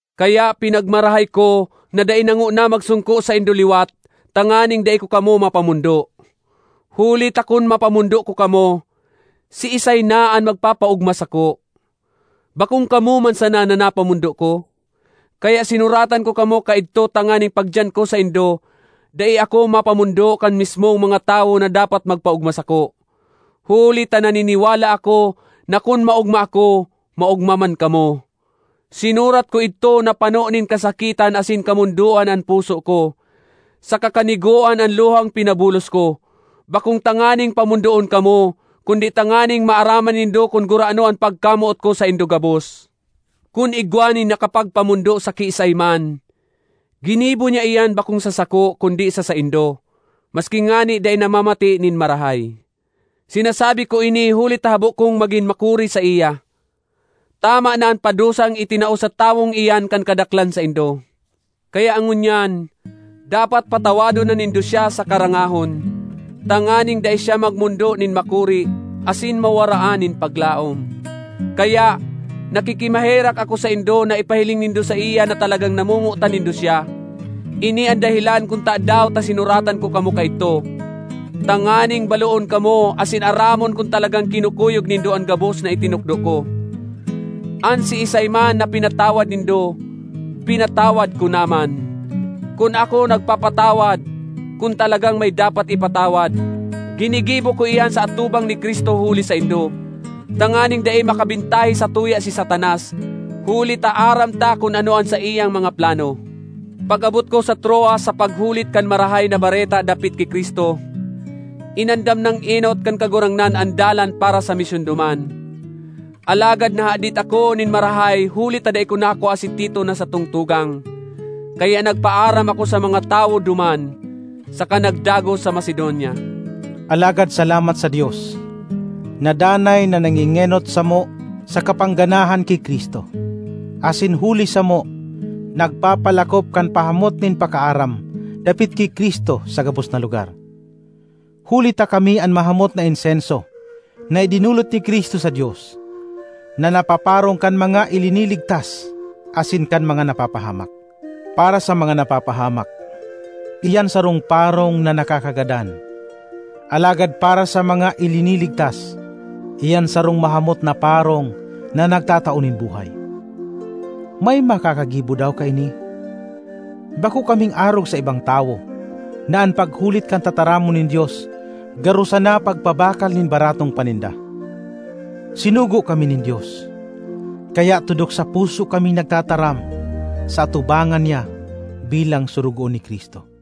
Kaya pinagmarahay ko na dai na ngona magsongko saindo liwat tanganing dai ko kamo mapamondo. Huli ta kun mapamondo ko kamo, siisay na an magpapaogma sako? Bakong kamo man sana na napamondo ko? Kaya sinuratan ko kamo kaidto tanganing pagdiyan ko saindo, dai ako mapamondo kan mismong mga tawo na dapat magpaogma sako. Huli ta naniniwala ako na kun maogma ako, maogma man kamo. Sinurat ko idto na pano nin kasakitan asin kamondoan an puso ko, saka kanigoan an luhang pinabulos ko, bakong tanganing pamondoon kamo, kundi tanganing maaraman nindo kun gurano an pagkamoot ko saindo gabos. Kun igwa nin nakapagpamondo sa kiisay man, ginibo niya iyan bakong sa sako, kundi sa saindo, maski ngani dai namamate nin marahay. (Sinasabi ko ini huli ta habo kong magin makuri saiya.) Tama na an padusang itinao sa tawong iyan kan kadaklan saindo. Kaya ngunyan, dapat patawadon na nindo siya saka rangahon, tanganing dai siya magmondo nin makuri, asin mawaraan nin paglaom. Kaya, nakikimaherak ako saindo na ipahiling nindo saiya na talagang namomotan nindo siya. Ini an dahelan kun tadaw ta sinuratan ko kamo kaidto: tanganing baloon kamo asin aramon kun talagang kinukuyog nindo an gabos na itinukdo ko. An siisay man na pinatawad nindo, pinatawad ko na man. Kun ako nagpapatawad—kun talagang may dapat ipatawad—ginigibo ko iyan sa atubang ni Cristo huli saindo, tanganing dai makabentahe satuya si Satanas; huli ta aram ta kun ano an saiyang mga plano. Pag-abot ko sa Troas sa paghulit kan Marahay na Bareta dapit ki Cristo, inandam nang enot kan Kagurangnan an dalan para sa misyon duman. Alagad nahadit ako nin marahay huli ta dai ko nakua si Tito na satong tugang. Kaya nagpaaram ako sa mga tawo duman, saka nagdagos sa Macedonia. Alagad salamat sa Dios, na danay na nangengenot samo sa kapangganahan ki Cristo, asin huli samo nagpapalakop kan pahamot nin pakaaram dapit ki Cristo sa gabos na lugar. Huli ta kami an mahamot na insenso na idinolot ni Cristo sa Dios, na napaparong kan mga iliniligtas asin kan mga napapahamak. Para sa mga napapahamak, iyan sarong parong na nakakagadan; alagad para sa mga iliniligtas, iyan sarong mahamot na parong na nagtatao nin buhay. May makakagibo daw kaini? Bako kaming arog sa ibang tawo na an paghulit kan tataramon nin Dios garo sana pagpabakal nin baratong paninda; sinugo kami nin Dios, kaya tudok sa puso kaming nagtataram sa atubangan niya bilang sorogoon ni Cristo.